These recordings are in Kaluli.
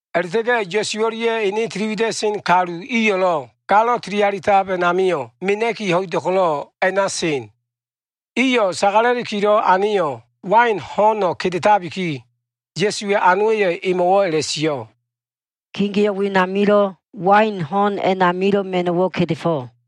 A꞉la꞉ta꞉ga꞉ Ya꞉su o꞉lia꞉ ene tili wida꞉sen kalu iyo꞉lo꞉ galo꞉ tililiab a꞉namio꞉ mena꞉ki ho꞉ido꞉ ko꞉lo꞉ a꞉na sen. Iyo꞉ sagala꞉likilo꞉ aneyo꞉ wain ho꞉no꞉ kedetabiki, Ya꞉suwa꞉ anowa꞉yo꞉ emo꞉wo꞉ a꞉la꞉sio꞉, “Kegeo꞉ wenamilo꞉ wain ho꞉n a꞉namilo꞉ ma꞉no꞉wo꞉ kedefo꞉.”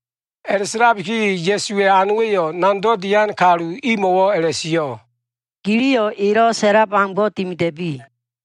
A꞉la꞉sa꞉labiki Ya꞉suwa꞉ anowa꞉yo꞉ nanogdo꞉ dian kalu imo꞉wo꞉ a꞉la꞉sio꞉, “Gio꞉ elo꞉ sa꞉lab au dimida꞉bi.”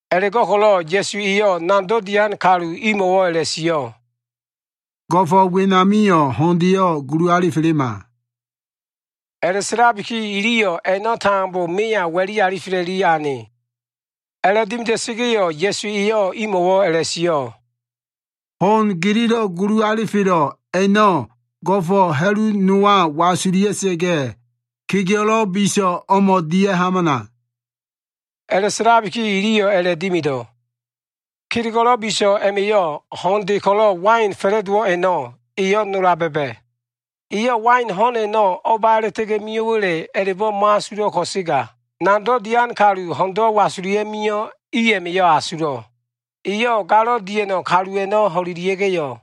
A꞉la꞉go꞉ko꞉lo꞉ Ya꞉su eyo꞉ nanogdo꞉ dian kalu imo꞉wo꞉ a꞉la꞉sio꞉, “Go꞉fo꞉ wenamio꞉ ho꞉ndeyo꞉ gulu alifelema.” A꞉la꞉sa꞉labiki iliyo꞉ a꞉no꞉ tambo meya wa꞉li alifela꞉i ane. A꞉la꞉dimida꞉sa꞉ga꞉yo꞉ Ya꞉su eyo꞉ imo꞉wo꞉ a꞉la꞉sio꞉, “Ho꞉n gililo꞉ gulu alifelo꞉ a꞉no꞉ go꞉fo꞉ ha꞉lu nowa wasulia꞉sa꞉ga꞉, kegeo꞉lo꞉ biso꞉ o꞉mo꞉ dia꞉ hamana.” A꞉la꞉sa꞉labiki iliyo꞉ a꞉la꞉dimido꞉. Kegeo꞉lo꞉ biso꞉ a꞉ma꞉yo꞉ ho꞉nde ko꞉lo꞉ wain fa꞉la꞉dowo꞉ a꞉no꞉ eyo꞉ nola ba꞉ba꞉. Eyo꞉ wain ho꞉n a꞉no꞉ o꞉ba a꞉la꞉ta꞉ga꞉ mio꞉wa꞉le a꞉la꞉bo꞉ mo꞉asulo꞉ ko꞉sega, nanogdo꞉ dian kalu ho꞉ndo꞉ wasulia꞉ mio꞉ i a꞉ma꞉yo꞉ asulo꞉. Eyo꞉ galo꞉ dia꞉no꞉ kalu a꞉no꞉ ho꞉lilia꞉ga꞉yo꞉,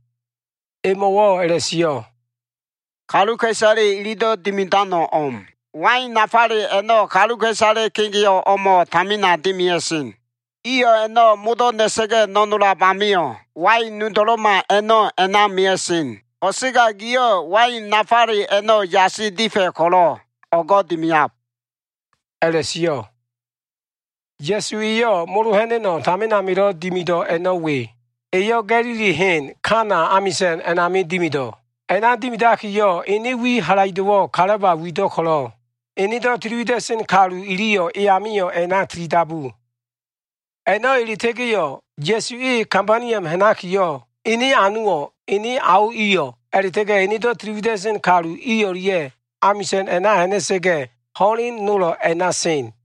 emo꞉wo꞉ a꞉la꞉sio꞉, “Kaluka꞉isale ililo꞉ dimidano꞉ o꞉m. Wain nafale a꞉no꞉ kaluka꞉isale kegeo꞉ o꞉mo꞉ tamina dimia꞉sen. Iyo꞉ a꞉no꞉ modo꞉ na꞉sa꞉ga꞉ no꞉nolab amio꞉, wain nudo꞉lo꞉ma a꞉no꞉ a꞉na mia꞉sen. Ko꞉sega giyo꞉ wain nafale a꞉no꞉ yasi difa꞉ ko꞉lo꞉ o꞉go꞉ dimiab” a꞉la꞉sio꞉. Ya꞉su eyo꞉ molo ha꞉na꞉no꞉ tamin amilo꞉ dimido꞉ a꞉no꞉ we. Eyo꞉ Ga꞉lili hen, Kana amisa꞉n a꞉nami dimido꞉. A꞉na dimidakiyo꞉ ene wi halaido꞉wo꞉ kalaba wido꞉ ko꞉lo꞉, enedo꞉ tili wida꞉sen kalu iliyo꞉ e amio꞉ a꞉na tili dabu. A꞉no꞉ eleta꞉ga꞉yo꞉, Ya꞉su e Kabaniom ha꞉nakiyo꞉, ene anowo꞉, ene ao iyo꞉, a꞉la꞉ta꞉ga꞉ enedo꞉ tiliwida꞉sen kalu i o꞉lia꞉ amisa꞉n a꞉na ha꞉na꞉sa꞉ga꞉, ho꞉len nolo꞉ a꞉na sen.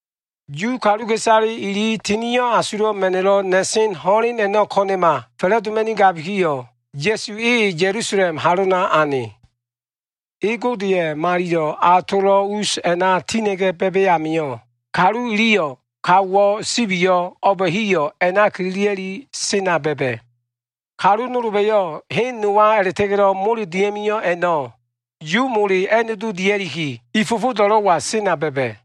Yu kaluka꞉isale ili Tinio꞉ Asulo꞉ Ma꞉no꞉lo꞉ na꞉sen ho꞉len a꞉no꞉ ko꞉na꞉ma fa꞉la꞉doma꞉nigabiyo꞉, Ya꞉su e Ya꞉lusalem halona ane. E Godeya꞉ Malilo꞉ a tolo꞉ us a꞉na tina꞉ga꞉ ba꞉ba꞉ amio꞉, kalu iliyo꞉ kaowo꞉, sibiyo꞉, o꞉ba꞉ hiyo꞉ a꞉na kililia꞉li sena ba꞉ba꞉. Kalu nolba꞉yo꞉ hen nowa a꞉la꞉ta꞉ga꞉lo꞉ mole dia꞉mio꞉ a꞉no꞉ Yu moleyo꞉ a꞉nodo dia꞉liki, i fofodo꞉lo꞉wa sena ba꞉ba꞉.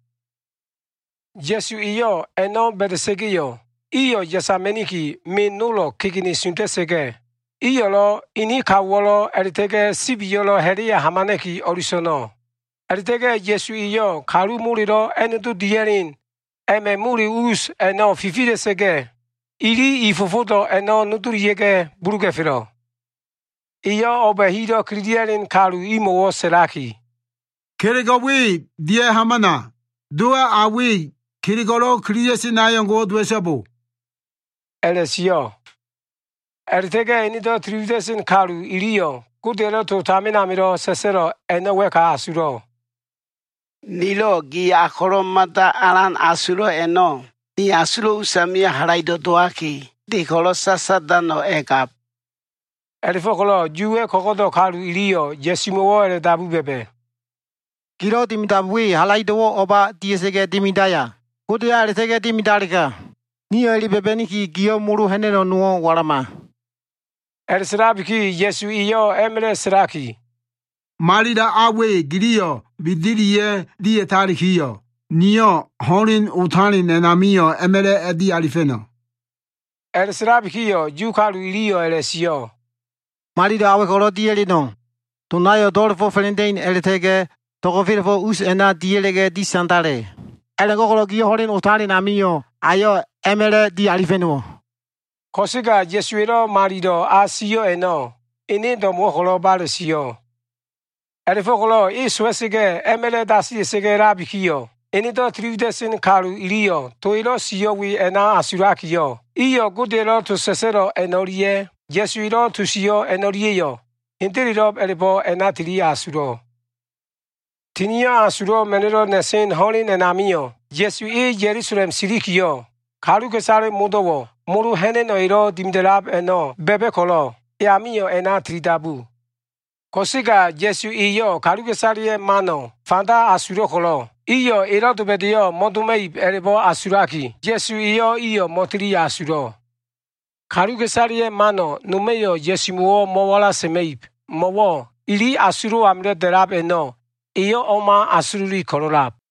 Ya꞉su eyo꞉ a꞉no꞉ ba꞉da꞉sa꞉ga꞉yo꞉, iyo꞉ yasama꞉niki me nolo꞉ kegene sunda꞉sa꞉ga꞉, iyo꞉lo꞉, ini kaowo꞉lo꞉ a꞉la꞉ta꞉ga꞉ sibiyo꞉lo꞉ ha꞉la꞉ya hamana꞉ki o꞉luso꞉no꞉. A꞉la꞉ta꞉ga꞉ Ya꞉su eyo꞉ kalu molelo꞉ a꞉nodo dia꞉len a꞉ma꞉ mole us a꞉no꞉ fifila꞉sa꞉ga꞉, ili i fofodo꞉ a꞉no꞉ nodolia꞉ga꞉ buluga꞉felo꞉. Eyo꞉ o꞉ba꞉ hilo꞉ kililia꞉len kalu imo꞉ sa꞉laki, “Kelego꞉ we dia꞉ hamana. Dowa꞉ a we kelego꞉lo꞉ kililia꞉sen a o꞉ngo꞉wo꞉ dowa꞉so꞉bo” a꞉la꞉sio꞉. A꞉la꞉ta꞉ga꞉ enedo꞉ tili wida꞉sen kalu iliyo꞉ Godeya꞉lo꞉ to tamin amilo꞉ sa꞉sa꞉lo꞉ a꞉no꞉ wa꞉ka asulo꞉, “Nilo꞉ gi a ko꞉lo꞉ mada alan asulo꞉ a꞉no꞉ ni asulo꞉ usamio꞉ halaido꞉ dowaki, de ko꞉lo꞉ sasadano꞉ a꞉ngab.” A꞉la꞉fo꞉ko꞉lo꞉ Yuwa꞉ ko꞉go꞉do꞉ kalu iliyo꞉ Ya꞉sumo꞉wo꞉ a꞉la꞉dabu ba꞉ba꞉, “Gilo꞉ dimidab we halaido꞉wo꞉ o꞉ba dia꞉sa꞉ga꞉ dimidaya? Godeya a꞉la꞉ta꞉ga꞉ dimilalega, nio꞉ ele ba꞉ba꞉niki giyo꞉ molo ha꞉na꞉no꞉ nowo꞉ walama.” A꞉la꞉sa꞉labiki Ya꞉su eyo꞉ a꞉ma꞉la꞉ sa꞉laki, “Malilo꞉ a we giliyo꞉ bidilia꞉ dia꞉talikiyo꞉, niyo꞉ ho꞉len otalen a꞉namio꞉ a꞉ma꞉la꞉ a꞉dialifa꞉no꞉.” A꞉la꞉sa꞉labikiyo꞉ Yu kalu iliyo꞉ a꞉la꞉sio꞉, “Malilo꞉ a we ko꞉lo꞉ dia꞉leno꞉, donayo꞉ do꞉la꞉fo꞉ fa꞉la꞉da꞉in a꞉la꞉ta꞉ga꞉ do꞉go꞉fela꞉fo꞉ us a꞉na dia꞉la꞉ga꞉ disandala꞉. A꞉la꞉go꞉ko꞉lo꞉ giyo꞉ ho꞉len otalen amio꞉ ayo꞉ a꞉ma꞉la꞉ dialifa꞉no꞉wo?” Ko꞉sega Ya꞉suwa꞉lo꞉ malilo꞉ a sio꞉ a꞉no꞉, ene do꞉mo꞉wo꞉ ko꞉lo꞉ bale sio꞉. A꞉la꞉fo꞉ko꞉lo꞉ e sowa꞉sa꞉ga꞉ a꞉ma꞉la꞉ dasilia꞉ga꞉ a꞉labikiyo꞉, enedo꞉ tili wida꞉sen kalu iliyo꞉ to elo꞉ sio꞉ we a꞉na asulakiyo꞉, iyo꞉ Godeya꞉lo꞉ to sa꞉sa꞉lo꞉ a꞉no꞉lia꞉ Ya꞉su elo꞉ to sio꞉ a꞉no꞉lia꞉yo꞉ hendelelo꞉b a꞉la꞉bo꞉ a꞉na tili asulo꞉. Tinio꞉ Asulo꞉ Ma꞉no꞉lo꞉ na꞉sen ho꞉len a꞉namio꞉, Ya꞉su e Ya꞉lusalem silikiyo꞉, kaluka꞉isale modo꞉wo꞉ molo ha꞉na꞉no꞉ elo꞉ dimida꞉lab a꞉no꞉ ba꞉ba꞉ ko꞉lo꞉, e amio꞉ a꞉na tili dabu. Ko꞉sega Ya꞉su eyo꞉ kaluka꞉isaleya꞉ mano꞉ fanda asulo꞉ ko꞉lo꞉, iyo꞉ elo꞉ doba꞉da꞉lo꞉ mo꞉doma꞉ib a꞉la꞉bo꞉ asulaki, Ya꞉su eyo꞉ iyo꞉ mo꞉tili asulo꞉. Kaluka꞉isaleya꞉ mano꞉ noma꞉yo꞉ Ya꞉sumo꞉wo꞉ mo꞉wala sa꞉ma꞉ib mo꞉wo꞉ ili asulo꞉ amilo꞉ da꞉lab a꞉no꞉ e o꞉ma asululi ko꞉lo꞉lab.